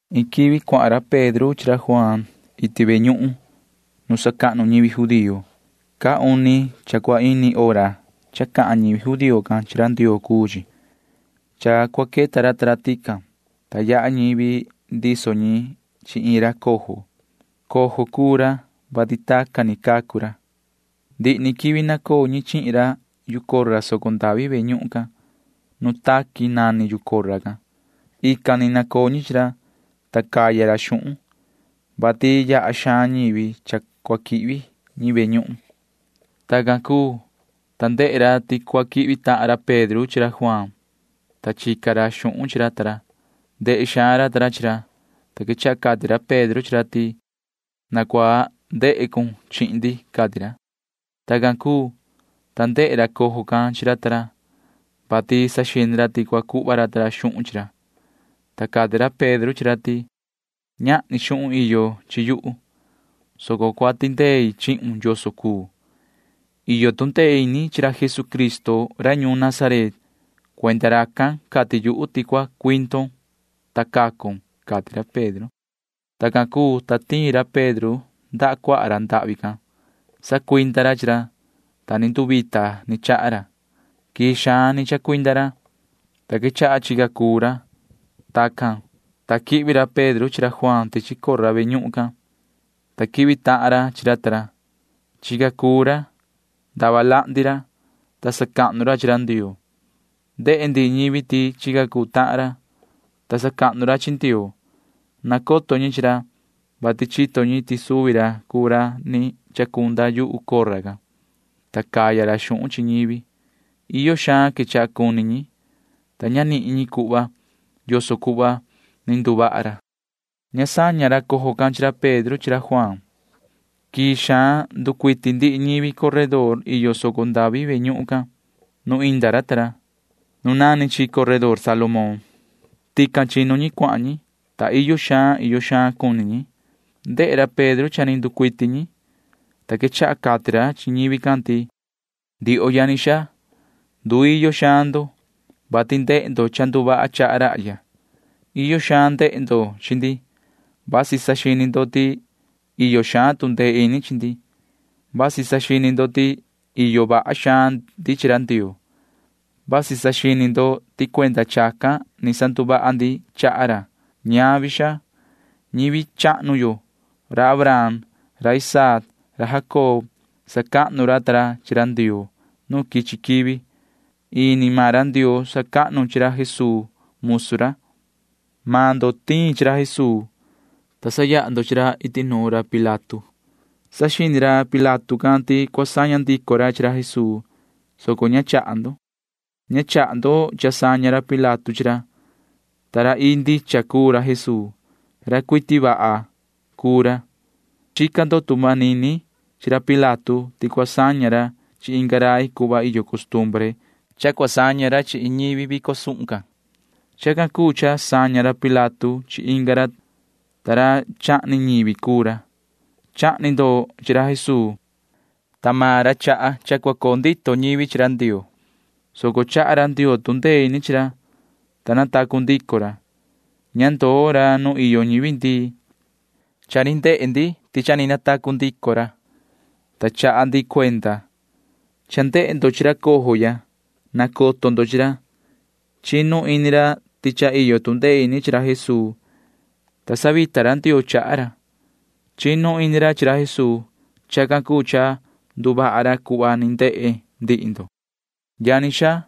Iin quivi cuahan ra Pedro chi ra Juaan iti ve ñuhun cahnu nu sacahnu ñivi judío. Caa uni cha cua ini hora cha cahan ñivi judío can chi ra Ndioo cuu chi. Cha cua queta ra ta ra tican, ta yaha ñivi ndiso ñi chi iin ra cojo. Cojo cuu ra, vati tacan ni cacu ra, ta ndihi ni quivi nacoo ñi chihin ra yu cora soco ndavi ve ñuhun can. Nu taqui nani yu cora can. Ican ni nacoo ñi chi ra, ta caya ra xuhun, vati yaha xaan ñivi cha cua quihvi ñi ve ñuhun. Tacan cuu, ta ndehe ra ti cua quihvi tahan ra Pedro chi ra Juaan, ta chica ra xuhun chi ra ta ra. Ndehe xaan ra ta ra chi ra, ta quechaha cati ra Pedro chi ra ti: ―Na cua ndehe cun chihin ndi ―cati ra. Tacan cuu, ta ndehe ra cojo can chi ra ta ra, vati saxini ra ti cua cuhva ra ta ra xuhun chi ra, ta cati ra Pedro chi ra ti: ―Ñahni xuhun iyo chi yuhu, soco cua tindei chihun yoso cuu. Iyo tu ndee ini chi ra Jesucristo ra ñuun Nazaret. Cuenda racan cati yuhu ti cua cuindon, ta cacon ―cati ra Pedro. Tacan cuu, ta tiin ra Pedro ndaha cuaha ra ndahvi can. Sacuinda ra chi ra, ta ni nduvita ni chaha ra. Quii xaan ni chacuinda ra, ta quechaha chica cuu ra. Tacan, ta quihvi ra Pedro chi ra Juaan tichi cora ve ñuhun can, ta quihvi tahan ra chi ra ta ra. Chica cuu ra. Ndava lahndi ra, ta sacahnu ra chi ra Ndioo. Ndehe ndihi ñivi ti chica cuu tahan ra, ta sacahnu ra chi Ndioo. Nacoto ñi chi ra, vati chito ñi ti suvi ra cuu ra ni chacunda yu cora can, ta caya ra xuhun chi ñivi. Iyo xaan quechaha cuni ñi, ta ña nihin ñi cuhva yoso cuhva ni nduvaha ra. Ña saña ra cojo can chi ra Pedro chi ra Juaan. Quii xaan nducuiti ndihi ñivi coredor iyo soco ndavi ve ñuhun can nu inda ra Pedro ta ra. Coredor Salomón nani chi. Tican chinu ñi cuahan ñi, ta iyo xaan iyo xaan cuni ñi. Ndehe ra Pedro cha ni nducuiti ñi, ta quechaha cati ra chi ñivi can ti: ―Ndioho yani xaa, nduiyo xaan ndo, vati ndehe ndo cha nduvaha chaha rahya. Iyo xaan ndehe ndo chi ndi. Vasi saxini ndo ti iyo xaan tu ndee ini chi ndi. Vasi saxini ndo ti iyo vaha xaan ndi chi ra Ndioo. Vasi saxini ndo ti cuenda chacan ni sanduvaha ndi chaha ra. Ñavi, xaa. Ñivi chahnu yo―ra Abraham, ra Isaac, ra Jacob―sacahnu ra ta ra chi ra Ndioo nu quichi quivi. Ini maan ra Ndioo sacahnu chi ra Jesuu musu ra. Maan ndo tiin chi ra Jesuu, ta sayaha ndo chi ra iti nuun ra Pilato. Saxini ra Pilato can ti cua saña ndico ra chi ra Jesuu, soco ña chaha ndo. Ña chaha ndo cha saña ra Pilato chi ra, ta ra ii ndicha cuu ra Jesuu. Ra cuiti vaha cuu ra, ta chica ndo tu manini chi ra Pilato ti cua saña ra chi inga rai cuhva iyo costumbre cha cua saña ra chi iin ñivi vico suhun can. Chacan cuu cha saña ra Pilato chi inga ra, ta ra chahni ñivi cuu ra. Chahni ndo chi ra Jesuu, ta maan ra chaha cha cua coo ndito ñivi chi ra Ndioo, soco chaha ra Ndioo tu ndee ini chi ra, ta natacu ndico ra. Ña ndoo ra nu iyo ñivi ndii. Cha ni ndehe maan ndi ti cha ni natacu ndico ra, ta chaha ndi cuenda. Cha ndehe ndo chi ra cojo ya. Nacoto ndo chi ra. Chinu ini ra ti cha iyo tu ndee ini chi ra Jesuu, ta sanduvita ra Ndioo chaha ra. Chinu ini ra chi ra Jesuu. Chacan cuu cha nduvaha ra cuhva ni ndehe ndihi ndo. ’Yani xaa,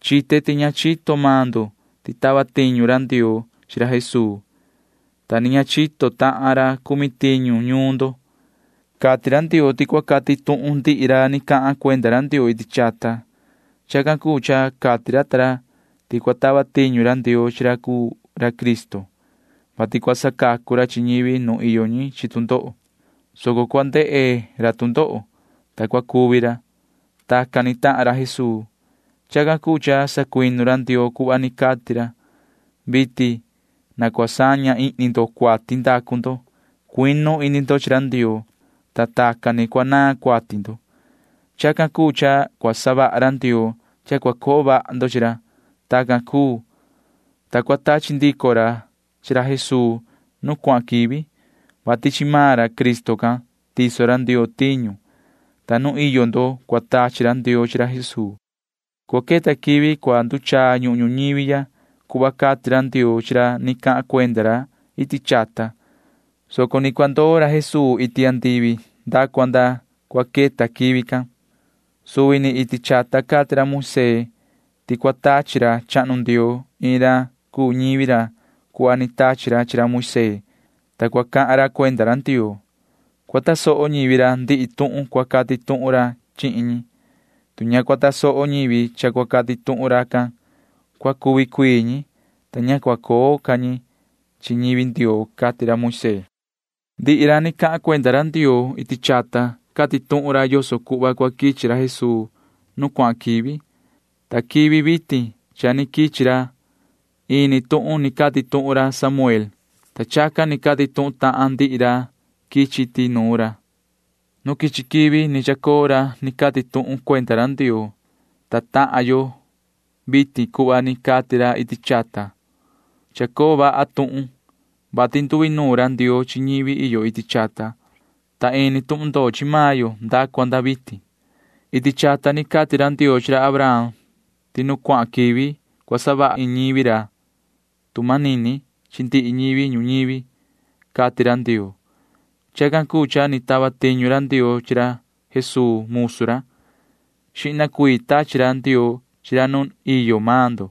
chite ti ña chito maan ndo ti tava tiñu ra Ndioo chi ra Jesuu, ta ni ña chito tahan ra cumi tiñu ñuun ndo. Cati ra Ndioo ti cua cati tuhun ndihi ra ni cahan cuenda ra iti chata. Chacan cuu cha cati ra ta ra ti cua tava tiñu ra Ndioo chi ra cuu ra Cristo, vati cua sacacu ra chi ñivi nu iyo ñi chi tu ndoho, soco cua ndehe ra tu ndoho, ta cua cuvi ra. Tacan ni tahan ra Jesuu. Chacan cuu cha sacuinu ra Ndioo cuhva ni cati ra. Vitin na cua saña ihni ndo cuati ndacu ndo. Cuinu ini ndo chi ra Ndioo, ta tacan ni cua naan cuati ndo. Chacan cuu cha cua savaha ra Ndioo cha cua coo vaha ndo chi ra. Tacan cuu, ta cua tachi ndico ra chi ra Jesuu nu cuahan quivi, vati chi maan ra Cristo can tiso ra Ndioo tiñu, ta nu iyo ndo cua tachi ra Ndioo chi ra Jesuu. Cua queta quivi cua nduchaa ñuhun ñuñivi ya cuhva cati ra Ndioo chi ra ni cahan cuenda ra iti chata, soco ni cua ndoo ra Jesuu iti andivi nda cua nda cua queta quivi can. Suvi ni iti chata cati ra Moisee ti cua tachi ra chahnu Ndioo iin ra cuu ñivi ra cuhva ni tachi ra chi ra Moisee, ta cua cahan ra cuenda ra Ndioo. Cua tasoho ñivi ra ndihi tuhun cua cati tuhun ra chihin ñi. Tu ña cua tasoho ñivi cha cua cati tuhun racan, cua cuvi cuii ñi, ta ña cua coo ca ñi chi ñivi Ndioo, cati ra Moisee. ’Ndihi ra ni cahan cuenda ra Ndioo iti chata cati tuhun ra yoso cuhva cua quichi ra Jesuu nu cuahan quivi, ta quivi vitin cha ni quichi ra. Ini tuhun ni cati tuhun ra Samuel, ta chacan ni cati tuhun tahan ndihi ra quichi iti nuun ra. Nu quichi quivi ni chacoo ra ni cati tuhun ra cuenda ra Ndioo, ta tahan yo vitin cuhva ni cati ra iti chata. Chacoo vaha tuhun, vati nduinuun ra Ndioo chi ñivi yo iti chata, ta ini tuhun ndoo chi maan yo nda cua nda vitin. Iti chata ni cati ra Ndioo chi ra Abraham ti nu cuahan quivi cua savaha iin ñivi ra tu manini chi ndihi ñivi ñuñivi, cati ra Ndioo. Chacan cuu cha ni tava tiñu ra Ndioo chi Jesuu musu ra. Xihna cuii tachi ra Ndioo chi ra nu iyo maan ndo,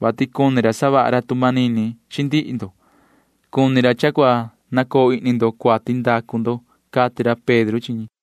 vati cuni ra savaha ra tu manini chi ndihi ndo. Cuni ra cha cua nacoo ihni ndo cuati ndacu ndo ―cati ra Pedro chi ñi.